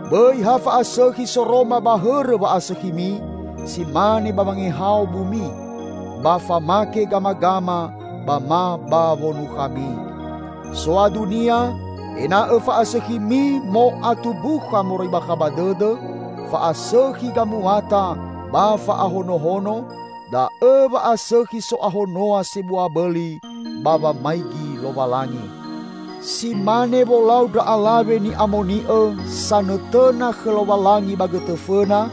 Bõi ha fa'asõkhi soroma ba hõrõ wa'asõkhimi si mane ba wangehao bumi, ba famake gamagama ba ma ba wonukhami. Soadunia, ena'õ fa'asõkhimi mo'atumbukha moroi bakha ba dõdõ, fa'asõkhi gamuata ba fa'ahonohono, da'õ wa'asõkhi so'ahonoa sebua bõli ba wamaigi Lowalangi. Si mane wolau ndra alawe ni'amoni'õ sanõtõna khõ Lowalangi ba gõtõ fõna,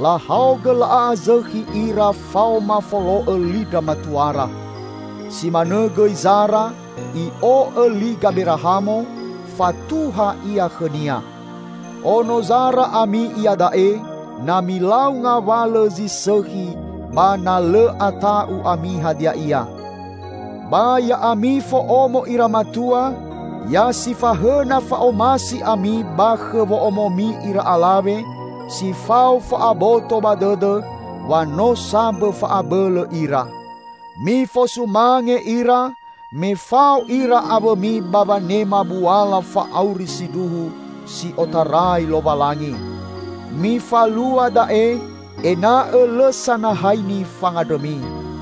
lahaogõ la'a'azõkhi ira faoma folo'õ li ndra matuara. Si manõ gõi Zara, i'o'õ li Gaberahamo, fatuha ia khõnia. Ono Zara ami iada'e, na milau ngawalõ zi sõkhi ba na lõ ata'u ami hadia ia. Ba ya'ami fo'omo ira matua, ya sifahõna fa'omasi ami ba khõ wo'omomi ira alawe, si fao fa'aboto ba dõdõ wa no sambõ fa'abõlõ ira. Mifosumange ira, me fao ira awõmi ba wanema buala fa'auri sindruhu si otarai Lowalangi. Mifalua da'e, ena'õ lõ sanahaini fangandrõmi.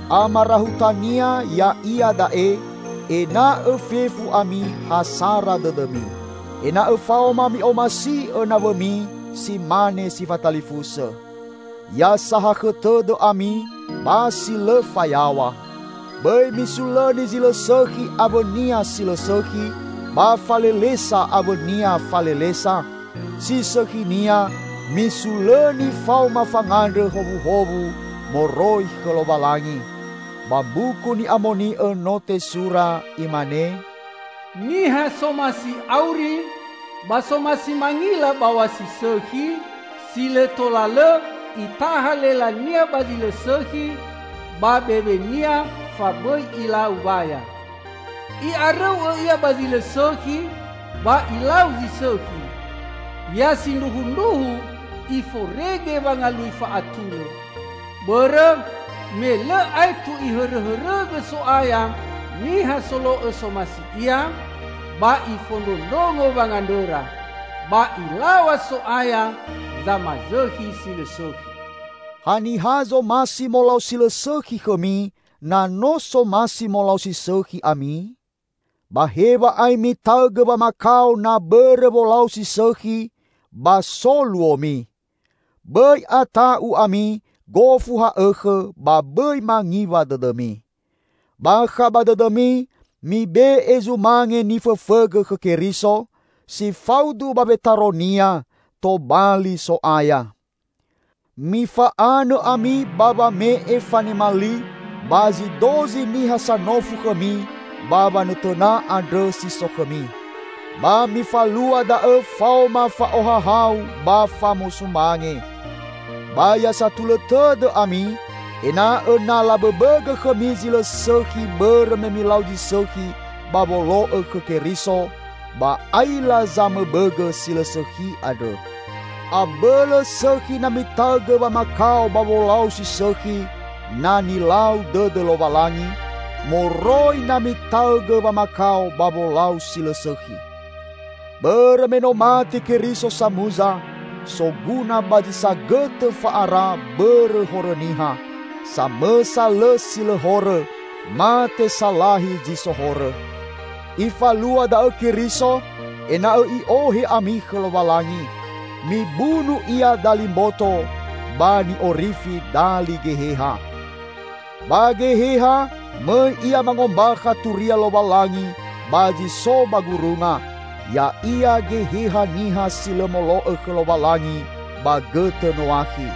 Amarahutania ya'ia da'e: ena'õ fefu ami ha sara dõdõmi. Ena'õ faoma mi'omasi'õ nawõmi si mane si fatalifusõ. Ya sahakhõ tõdõ ami ba si lõ fayaw̃a. Bõi misulõni zi lõ sõkhi awõnia si lõ sõkhi, ba falelesa awõnia falelesa; si sõkhinia, misulõni faoma fangandrõ howuhowu moroi khõ Lowalangi. Ba Mbuku Ni'amoni'õ no tesura, imane, "Niha somasi auri, ba somasi mangila baw̃a si sõkhi, si lõ tola lõ itaha lelania ba zi lõ sõkhi, ba bewenia fabõi ilau waya. I'arõu'õ ia ba zi lõ sõkhi ba ilau zi sõkhi, ya sindruhundruhu iforege wangalui fa'atulõ. Bõrõ me lõ aetu Ihõrõhõrõgõ So'aya niha solo'õ somasi Ia, ba Ifondrondrongo wangandrõra, ba Ilaw̃a So'aya zamazõkhi si lõ sõkhi." Haniha zomasi molau si lõ sõkhi khõmi, na no somasi molau si sõkhi ami? Ba hew̃a'ae mitaõgõ wamakao na bõrõ wolau si sõkhi, ba so luomi! Bõi ata'u ami gofu ha'õkhõ, ba bõi mangiwa dõdõmi. Bakha ba dõdõmi, mibe'e zumange nifõfõgõ khõ Keriso, si faudu ba wetaro-Nia, tobali So'aya. Mifa'anõ ami ba wame'e fanema li ba zi dozi niha sanofu khõmi ba wanõtõna andrõ si so khõmi. Ba mifalua da'õ faoma fa'ohahau ba famosumange. Ba ya satulõ tõdõ ami, ena'õ na labõbõgõ khõmi zi lõ sõkhi bõrõ me milau zi sõkhi ba wolo'õ khõ Keriso, ba aila zamõbõgõ si lõ sõkhi andrõ. Abõlõ sõkhi na mitaõgõ wamakao ba wolau si sõkhi -- na nilau dõdõ Lowalangi -- moroi na mitaõgõ wamakao ba wolau si lõ sõkhi. Bõrõ me no mate Keriso samuza, soguna ba zi sagõtõ fa'ara bõrõ horõ niha -- samõsa lõ si lõ horõ, mate salahi zi so horõ. Ifalua da'õ Keriso, ena'õ I'ohe ami khõ Lowalangi. Mibunu Ia dali mboto, ba ni'orifi dali geheha. Ba geheha, mõi Ia mangombakha turia Lowalangi ba zi so ba gurunga: ya'ia geheha niha si lõ molo'õ khõ Lowalangi ba gõtõ Noakhi.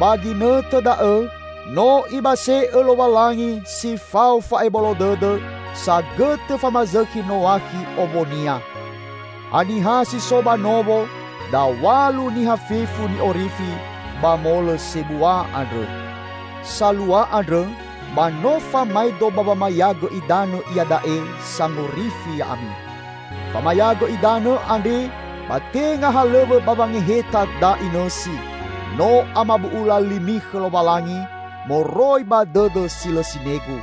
Ba ginõtõ da'õ no Ibase'õ Lowalangi si fao fa'ebolo dõdõ sagõtõ famazõkhi Noakhi owonia. Ha niha si so ba nowo -- daw̃alu niha fefu -- ni'orifi ba molõ sebua andrõ. Salua andrõ ba no famaedo ba wamayagõ idanõ iada'e sangorifi ya'ami. Famayagõ idanõ andre ba tenga halõw̃õ ba wangeheta da'i nõsi, no amabu'ula limi khõ Lowalangi, moroi ba dõdõ si lõ sinegu.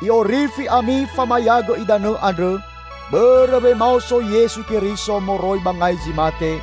I'orifi ami famayagõ idanõ andrõ, bõrõ wemaoso Yesu Keriso moroi ba ngai zi mate,